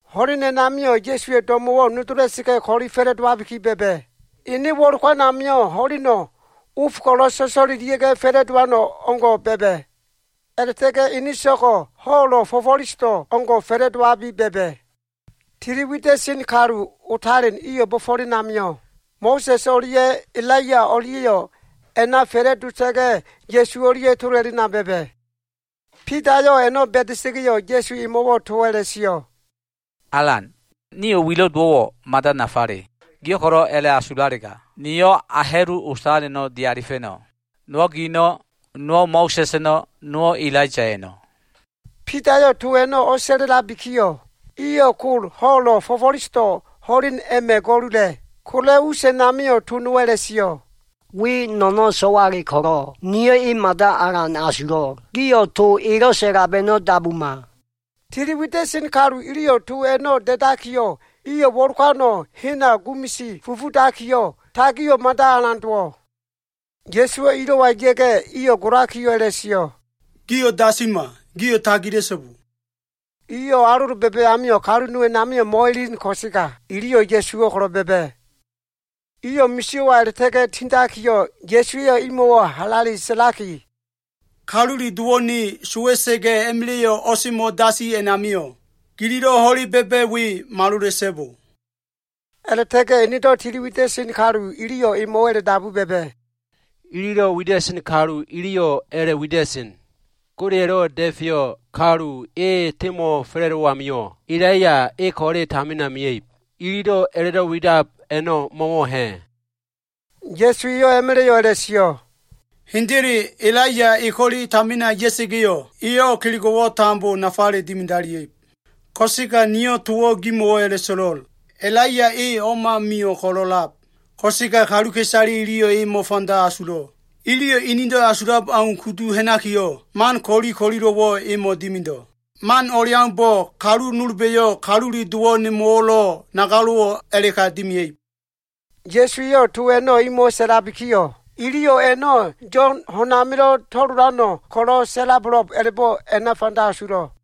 Ho꞉len a꞉namio꞉ Ya꞉suwa꞉ do꞉mo꞉wo꞉ nodola꞉sa꞉ga꞉, ko꞉li fa꞉la꞉dowabiki ba꞉ba꞉. Ene wo꞉lokan amio꞉ ho꞉leno꞉ of ko꞉lo꞉ so꞉so꞉lelia꞉ga꞉ fa꞉la꞉dowan o꞉ngo꞉ ba꞉ba꞉. A꞉la꞉ta꞉ga꞉ ene so꞉go꞉ ho꞉lo꞉ fo꞉fo꞉lesodo꞉ o꞉ngo꞉ fa꞉la꞉dowabi ba꞉ba꞉. Tili wida꞉sen kalu otalen iyo꞉ bo꞉fo꞉len amio꞉, Mo꞉sa꞉s o꞉lia꞉ Elaiya o꞉lia꞉yo꞉ a꞉na fa꞉la꞉dota꞉ga꞉, Ya꞉su o꞉lia꞉ tola꞉lena ba꞉ba꞉. Bidayo꞉ a꞉no꞉ ba꞉da꞉sa꞉ga꞉yo꞉, Ya꞉su emo꞉wo꞉ towo꞉ a꞉la꞉sio꞉, “Alan, nio꞉ wilo꞉ dowo꞉wo꞉ mada nafale. Giyo꞉ ko꞉lo꞉ a꞉la꞉asulalega, niyo꞉ a ha꞉lu otaleno꞉ dialifa꞉no꞉. Nowo꞉ gino꞉, nowo꞉ Mo꞉sa꞉s eno꞉, nowo꞉ Elaiya eno꞉.” Bidayo꞉ to a꞉no꞉ o꞉sa꞉la꞉labikiyo꞉, iyo꞉ kol ho꞉lo꞉ fo꞉fo꞉lesodo꞉ ho꞉len a꞉ma꞉ ga꞉lula꞉. Kola꞉ us a꞉namio꞉, to nowo꞉ a꞉la꞉sio꞉, “We no꞉no꞉ so꞉wale ko꞉lo꞉, niyo꞉ e mada alan asulo꞉. Gio꞉ to elo꞉ sa꞉lab a꞉no꞉ dabuma.” Tili wida꞉sen kalu iliyo꞉ to a꞉no꞉ da꞉dakiyo꞉, iyo꞉ wo꞉lokano꞉ hena gumisi fufudakiyo꞉, tagio꞉ mada alan dowo꞉. Ya꞉suwo꞉ ilo꞉wa ya꞉ga꞉, iyo꞉ golakiyo꞉ a꞉la꞉sio꞉, “Gio꞉ dasima. Gio꞉ tagila꞉so꞉bo.” Iyo꞉ alolo ba꞉ba꞉ amio꞉, kalu nowo꞉ a꞉namio꞉ mo꞉elen ko꞉sega, iliyo꞉ Ya꞉suwo꞉ ko꞉lo꞉ ba꞉ba꞉. Iyo꞉ misio꞉wa a꞉la꞉ta꞉ga꞉ tindakiyo꞉, Ya꞉su eyo꞉ imo꞉wo꞉ halale sa꞉laki, “Kalule Dowo꞉ ne sowa꞉sa꞉ga꞉ a꞉ma꞉la꞉yo꞉ o꞉semo꞉ dasi a꞉namio꞉, gililo꞉ ho꞉le ba꞉ba꞉ we malola꞉so꞉bo.” A꞉la꞉ta꞉ga꞉ enedo꞉ tili wida꞉sen kalu iliyo꞉ emo꞉wo꞉ a꞉la꞉dabu ba꞉ba꞉, “Elelo꞉ wida꞉sen kalu iliyo꞉ a꞉la꞉wida꞉sen, ‘Godeya꞉lo꞉ Da꞉feyo꞉ Kalu e semo꞉fa꞉la꞉dowo꞉ amio꞉, Elaiya e ko꞉le tamina mea꞉ib.’ Ililo꞉ a꞉la꞉do꞉ widab a꞉no꞉ mo꞉wo꞉ ha꞉?” Ya꞉su eyo꞉ a꞉ma꞉la꞉yo꞉ a꞉la꞉sio꞉, “Hendele, Elaiya e ko꞉le tamina ya꞉sa꞉ga꞉yo꞉, eyo꞉ kelego꞉wo꞉ tambo nafale dimidalia꞉ib. Ko꞉sega niyo꞉ towo꞉ gimo꞉wo꞉ a꞉la꞉so꞉lo꞉l. Elaiya e o꞉ma mio꞉ ko꞉lo꞉lab, ko꞉sega kaluka꞉isale iliyo꞉ e mo꞉fanda asulo꞉. Iliyo꞉ inido꞉ asulab au kudu ha꞉nakiyo꞉, man ko꞉li ko꞉lilo꞉wo꞉ emo꞉ dimido꞉. Man o꞉leaumbo꞉, kalu nolba꞉yo꞉ Kalule Dowo꞉ nemo꞉wo꞉lo꞉ nagalo꞉wo꞉ a꞉la꞉ka dimia꞉ib.” Ya꞉su eyo꞉ to a꞉no꞉ imo꞉wo꞉ sa꞉labikiyo꞉, iliyo꞉ a꞉no꞉ Yo꞉n ho꞉n amilo꞉ to꞉lolano꞉ ko꞉lo꞉ sa꞉labo꞉lo꞉b a꞉la꞉bo꞉ a꞉na fanda asulo꞉.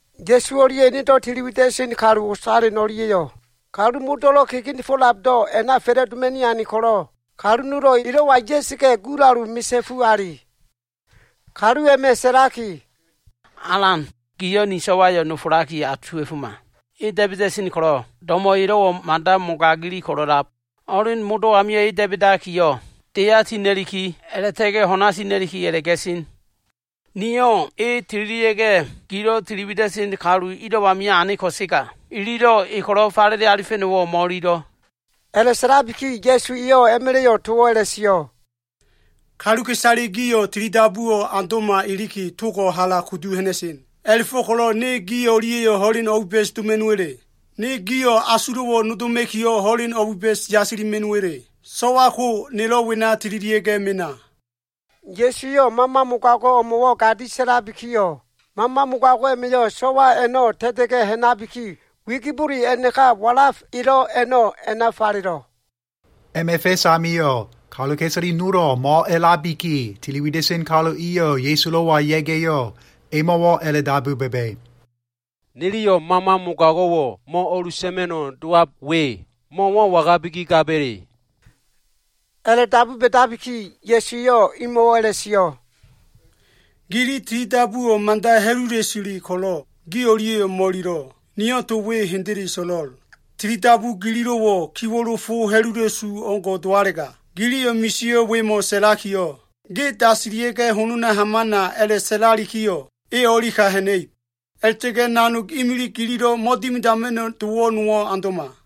Ya꞉su o꞉lia꞉ enedo꞉ tili wida꞉sen kalu otalen o꞉lia꞉yo꞉, kalu modo꞉lo꞉ kegenefo꞉labdo꞉ a꞉na fa꞉la꞉doma꞉ni ane ko꞉lo꞉, kalu nowo꞉ elo꞉wa ya꞉sa꞉ga꞉, gulalu misa꞉fu ali. Kalu a꞉ma꞉ sa꞉laki, “Alan, giyo꞉ ni so꞉wayo꞉ nofolaki asuwa꞉foma. E da꞉ba꞉da꞉sen ko꞉lo꞉, do꞉mo꞉ elo꞉wo꞉ mada mogago꞉le ko꞉lo꞉ a꞉lab. Ho꞉len modo꞉ amio꞉ e da꞉ba꞉dakiyo꞉, deya tina꞉liki, a꞉la꞉ta꞉ga꞉ ho꞉na tina꞉liki a꞉la꞉ga꞉sen. Niyo꞉ e tililia꞉ga꞉, gilo꞉ tili wida꞉sen ilo꞉ amio꞉ ane ko꞉sega, iliyo꞉ e ko꞉lo꞉ falele alifa꞉no꞉wo꞉ mo꞉ililo꞉.” A꞉la꞉sa꞉labiki Ya꞉su eyo꞉ a꞉ma꞉la꞉yo꞉ towo꞉ a꞉la꞉sio꞉, “Kaluka꞉isale gio꞉ tilidabuwo꞉ aundo꞉ma iliki, togo꞉ hala kudu ha꞉na꞉sen. A꞉la꞉fo꞉ko꞉lo꞉ ne gi o꞉lia꞉yo꞉ ho꞉len o꞉biba꞉s doma꞉no꞉wa꞉le? Ne gio꞉ asulo꞉wo꞉ nodoma꞉kiyo꞉ ho꞉len o꞉biba꞉s yasilima꞉no꞉wa꞉le? So꞉wa ko, nelo꞉ wena tililia꞉ mena.” Ya꞉su eyo꞉ mama mogago꞉ o꞉mo꞉wo꞉ gadi sa꞉labikiyo꞉, mama mogago꞉ a꞉ma꞉yo꞉ so꞉wa a꞉no꞉ ta꞉ta꞉ga꞉ ha꞉nabiki, wigibole a꞉naka walaf elo꞉ a꞉no꞉ a꞉na falelo꞉. A꞉ma꞉ fa꞉s amio꞉, kaluka꞉isale nolo꞉ mo꞉a꞉labiki, tili wida꞉sen kalu iyo꞉ Ya꞉sulo꞉wa ya꞉ga꞉yo꞉, emo꞉wo꞉ a꞉la꞉dabu ba꞉ba꞉, “Niliyo꞉ mama mogago꞉wo꞉ mo꞉ o꞉lusa꞉ma꞉no꞉ dowab we, mo꞉wo꞉ wangabiki gaba꞉le?” A꞉la꞉dabu ba꞉dabiki, Ya꞉su eyo꞉ imo꞉wo꞉ a꞉la꞉sio꞉, “Gili tili dabuwo꞉ mada ha꞉lula꞉sule ko꞉lo꞉, gi o꞉lia꞉yo꞉ mo꞉ililo꞉. Niyo꞉ to we hendele so꞉lo꞉l. Tilidabu gililo꞉wo꞉, kiwo꞉lo fo ha꞉lula꞉su o꞉ngo꞉ dowalega, giliyo꞉ misio꞉ wemo꞉ sa꞉lakiyo꞉, ‘Ge dasilia꞉ga꞉ honona hamana,’ a꞉la꞉sa꞉lalikiyo꞉, e o꞉li ka ha꞉na꞉ib. A꞉la꞉ta꞉ga꞉ nanog imilig gililo꞉ mo꞉dimidama꞉no꞉ dowo꞉ nowo꞉ aundo꞉ma.”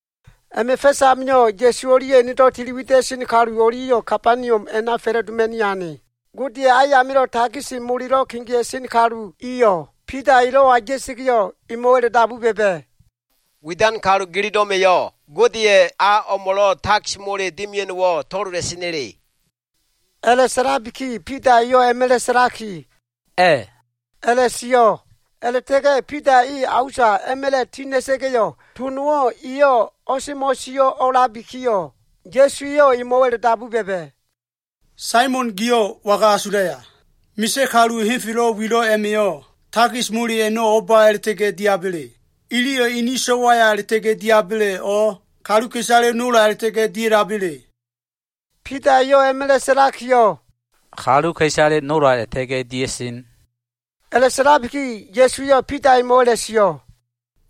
A꞉ma꞉ fa꞉s amio꞉, Ya꞉su o꞉lia꞉ enedo꞉ tili wida꞉sen kalu o꞉lia꞉yo꞉ Kabaniom a꞉na fa꞉la꞉doma꞉ni ane. Godeya꞉ ayamilo꞉ takis molelo꞉ kegea꞉sen kalu iyo꞉ Bida elo꞉wa ya꞉sa꞉ga꞉yo꞉, emo꞉wo꞉ a꞉la꞉dabu ba꞉ba꞉, “Widan kalu gililo꞉ma꞉yo꞉ Godeya꞉ a o꞉mo꞉lo꞉ takis mole dimia꞉no꞉wo꞉ to꞉lola꞉sena꞉le?” A꞉la꞉sa꞉labiki Bida eyo꞉ a꞉ma꞉la꞉ sa꞉laki, “A꞉” a꞉la꞉sio꞉. A꞉la꞉ta꞉ga꞉ Bida e a usa a꞉ma꞉la꞉ ti ha꞉na꞉ga꞉yo꞉, to nowo꞉ eyo꞉ o꞉semo꞉ sio꞉ a꞉labikiyo꞉, Ya꞉su eyo꞉ emo꞉wo꞉ a꞉la꞉dabu ba꞉ba꞉, “Saimon giyo꞉ waga asulaya? Misa꞉ kalu henfelo꞉ wilo꞉ a꞉ma꞉yo꞉, takis mole a꞉no꞉ o꞉ba a꞉la꞉ta꞉ga꞉ diaba꞉le? Iliyo꞉ ini so꞉waya a꞉la꞉ta꞉ga꞉ diaba꞉le, o꞉ kaluka꞉isale nola a꞉la꞉ta꞉ga꞉ dia꞉laba꞉le?” Bida eyo꞉ a꞉ma꞉la꞉ sa꞉lakiyo꞉, “Kaluka꞉isale nola a꞉la꞉ta꞉ga꞉ dia꞉sen.” A꞉la꞉sa꞉labiki Ya꞉su eyo꞉ Bida emo꞉wo꞉ a꞉la꞉sio꞉,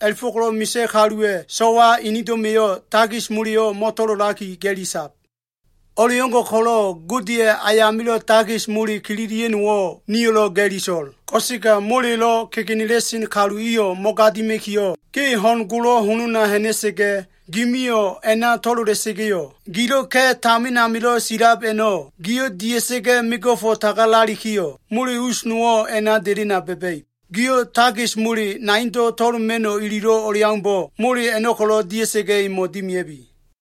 “A꞉la꞉fo꞉ko꞉lo꞉ misa꞉ kaluwa꞉ so꞉wa inido꞉ma꞉yo꞉ takis moleyo꞉ mo꞉to꞉lolaki, ga꞉li sab. O꞉leo꞉ngo꞉ ko꞉lo꞉, Godeya꞉ ayamilo꞉ takis mole kililia꞉no꞉wo꞉ nio꞉lo꞉ ga꞉li so꞉l. Ko꞉sega molelo꞉ kegenela꞉sen kalu iyo꞉ mo꞉gadima꞉kiyo꞉, ge ho꞉n golo꞉ holona ha꞉na꞉sa꞉ga꞉, gimiyo꞉ a꞉na to꞉lola꞉sa꞉ga꞉yo꞉, gilo꞉ ka꞉ tamin amilo꞉ silab a꞉no꞉, giyo꞉ dia꞉sa꞉ga꞉ mego꞉fo꞉ tagalalikiyo꞉, mole us nowo꞉ a꞉na delena ba꞉ba꞉ib. Giyo꞉ takis mole naindo꞉ to꞉loma꞉no꞉ ililo꞉ o꞉leaumbo꞉, mole a꞉no꞉ ko꞉lo꞉ dia꞉sa꞉ga꞉ imo꞉ dimia꞉bi.”